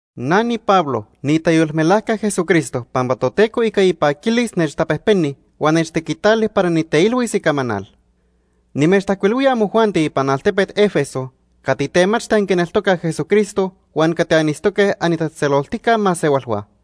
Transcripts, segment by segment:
Na niPablo niitayolmelajca Jesucristo pampa Toteco ica ipaquilis nechtapejpeni huan nechtequitali para niteilhuis icamanal. Nimechtajcuilhuía amojuanti ipan altepet Éfeso cati temachti anquineltocaj Jesucristo huan cati anitztoque anitatzejtzeloltica masehualhua.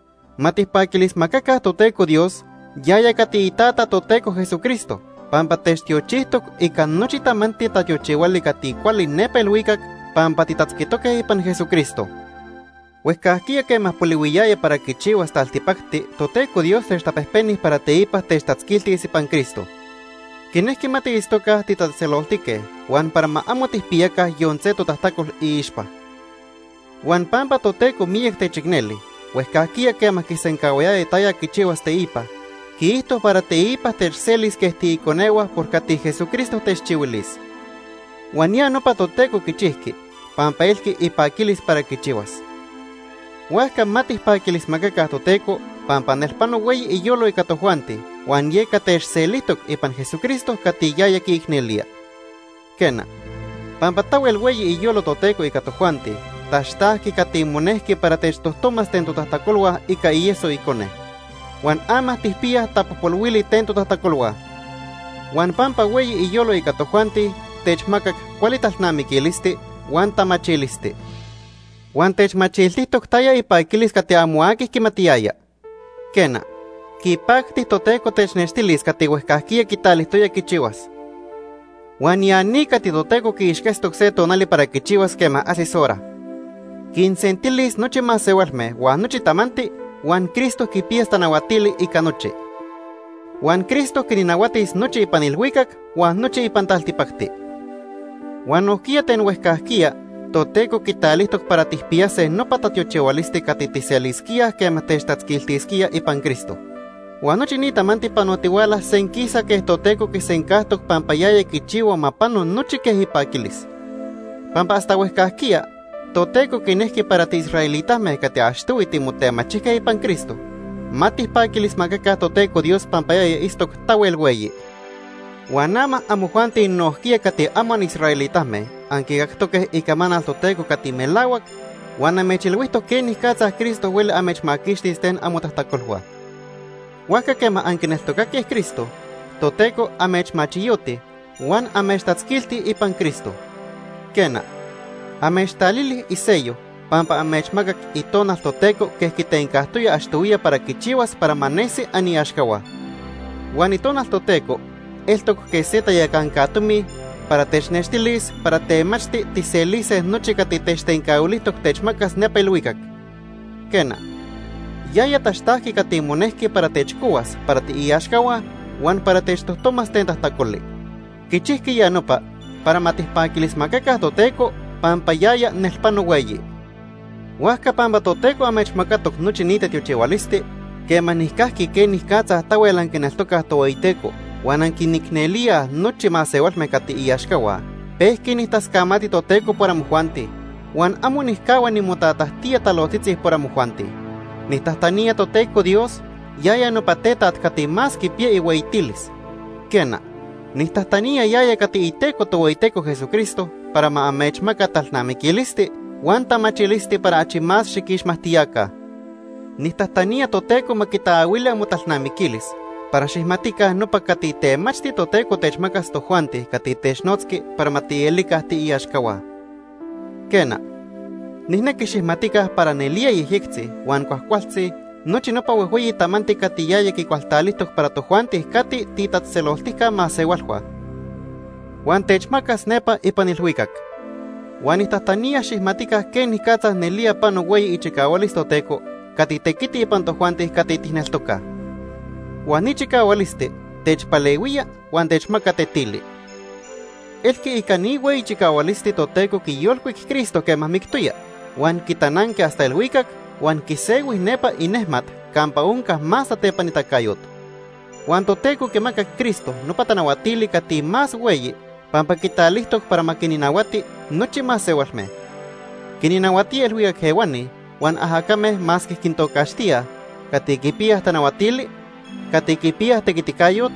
Ma tijpaquilismacaca Toteco Dios, yaya cati iTata Toteco Jesucristo, pampa techtiochijtoc ica nochi tamanti tatiochihuali cati cuali nepa ilhuicac pampa titatzquitoque ipan Jesucristo. Huejcajquiya quema polihuiyaya para quichihuas taltipacti Toteco Dios techtapejpeni para teipa techtatzquiltis ipan Cristo. Quinejqui ma tiitztoca titatzejtzeloltique huan para ma amo tijpiyaca yon se totajtacol iixpa. Huan pampa Toteco miyac techicneli, huejcajquiya quema quisencahuayaya taya quichihuas teipa, quiijto para teipa techselis quej tiiconehua por cati Jesucristo techchihuilis. Huan ya nopa Toteco quichijqui pampa elqui ipaquilis para quichihuas. Huajca ma tijpaquilismacaca Toteco pampa nelpano hueyi iyolo ica tojuanti huan yeca techselijtoc ipan Jesucristo cati yaya quiicnelía. Quena, pampa tahuel hueyi iyolo Toteco ica tojuanti, taxtajqui cati monejqui para techtojtomas ten totajtacolhua ica ieso Icone. Huan ama tijpiyaj tapojpolhuili ten totajtacolhua. Huan pampa hueyi iyolo ica tojuanti techmacac cuali talnamiquilisti huan tamachilisti. Huan techmachiltijtoc taya ipaquilis cati amo aqui quimatiyaya. Quena, quipacti Toteco technextilis cati huejcajquiya quitalijtoya quichihuas. Huan ya ni cati Toteco quiixquetztoc se tonali para quichihuas quema ajsis hora. Quinsentilis nochi masehualme huan nochi tamanti, huan Cristo quipiyas tanahuatili ica nochi. Huan Cristo quinnahuatis nochi ipan ilhuicac huan nochi ipan taltipacti. Huan nojquiya ten huejcajquiya Toteco quitalijtoc para tijpiyase nopa tatiochihualisti cati tijselisquíaj quema techtatzquiltisquía ipan Cristo. Huan nochi ni tamanti panotihuala senquisa quej Toteco quisencajtoc pampa yaya quichihua ma pano nochi quej ipaquilis. Pampa hasta huejcajquiya Toteco quinejqui para tiisraelitame cati achtohui timotemachijque ipan Cristo, ma tijpaquilismacaca Toteco Dios pampa yaya itztoc tahuel hueyi. Huan ama amojuanti nojquiya cati amo anisraelitame anquicactoque icamanal Toteco cati melahuac huan amechilhuijtoc quenicatza Cristo hueli amechmaquixtis ten amotajtacolhua. Huajca quema anquineltocaque Cristo, Toteco amechmachiyoti huan amechtatzquilti ipan Cristo. Quena, amechtalili iseyo pampa amechmacac Itonal Toteco quej quitencajtoya achtohuiya para quichihuas para ma nesi aniaxcahua. Huan Itonal Toteco eltoc quej se tayacanca tomi para technextilis para temachti tijselise nochi cati techtencahuilijtoc techmacas nepa ilhuicac. Quena, yaya taxtajqui cati monejqui para techcohuas para tiiaxcahua huan para techtojtomas ten tajtacoli. Quichijqui ya nopa para ma tijpaquilismacaca Toteco pampa yaya nel pano hueyi. Huajca pampa Toteco amechmacatoc nochi ni tatiochihualisti, quema nijcajqui quenicatza tahuel anquineltocaj Tohueyiteco huan anquinicnelíaj nochi masehualme cati iaxcahua, pejqui nijtascamati Toteco por amojuanti. Huan amo nijcahua nimotatajtía talojtzitzi por amojuanti. Nijtajtanía Toteco Dios, yaya nopa Tetaj cati más quipiya ihueyitilis. Quena, nijtajtanía yaya cati Iteco Tohueyiteco Jesucristo para ma amechmaca talnamiquilisti huan tamachilisti para achi más xiquixmajtiyaca. Nijtajtanía Toteco ma quitaahuili amotalnamiquilis para xijmatica nopa cati temachti Toteco techmacas tojuanti cati technotzqui para ma tielica tiiaxcahua. Quena, nijnequi xijmatica para nelía yejyectzi huan cuajcualtzi nochi nopa huejhueyi tamanti cati yaya quicualtalijtoc para tojuanti cati tiitatzejtzeloltijca masehualhua huan techmacas nepa ipan ilhuicac. Huan nijtajtanía xijmatica quenicatza nelía pano hueyi ichicahualis Toteco cati tequiti ipan tojuanti cati tijneltocaj. Huan ni chicahualisti techpalehuía huan techmaca tetili. Elqui ica ni hueyi chicahualisti Toteco quiyolcuic Cristo quema mictoya, huan quitananqui hasta ilhuicac huan quisehui nepa inejmat campa onca más tatepanitacayot. Huan Toteco quimacac Cristo nopa tanahuatili cati más hueyi pampa quitalijtoc para ma quinnahuati nochi masehualme. Quinnahuatía ilhuicac ehuani huan ajacame masque quintocaxtíaj: cati quipiyaj tanahuatili, cati quipiyaj tequiticayot,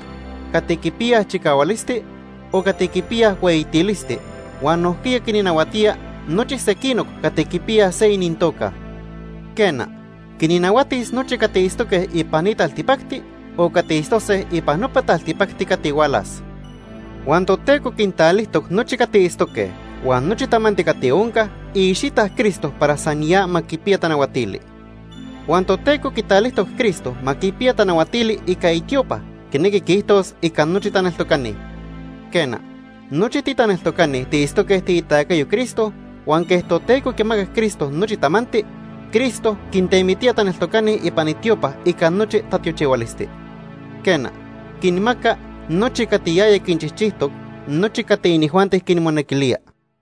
cati quipiyaj chicahualisti, o cati quipiyaj hueyitilisti; huan nojquiya quinnahuatía nochi sequinoc cati quipiyaj se inintoca. Quena, quinnahuatis nochi cati itztoque ipan ni taltipacti o cati itztose ipan nopa taltipacti cati hualas. Huan Toteco quintalijtoc nochi cati itztoque huan nochi tamanti cati onca iicxita Cristo para san ya ma quipiya tanahuatili. Huan Toteco quitalijtoc Cristo ma quipiya tanahuatili ica itiopa, quinequi quiijtos ica nochi titaneltocani. Quena, nochi titaneltocani tiitztoque tiitacayo Cristo huan quej Toteco quimacac Cristo nochi tamanti, Cristo quitemitía taneltocani ipan itiopa ica nochi tatiochihualisti. Quena, quinmaca nochi cati yaya quinchijchijtoc, nochi cati inijuanti quinmonequilía.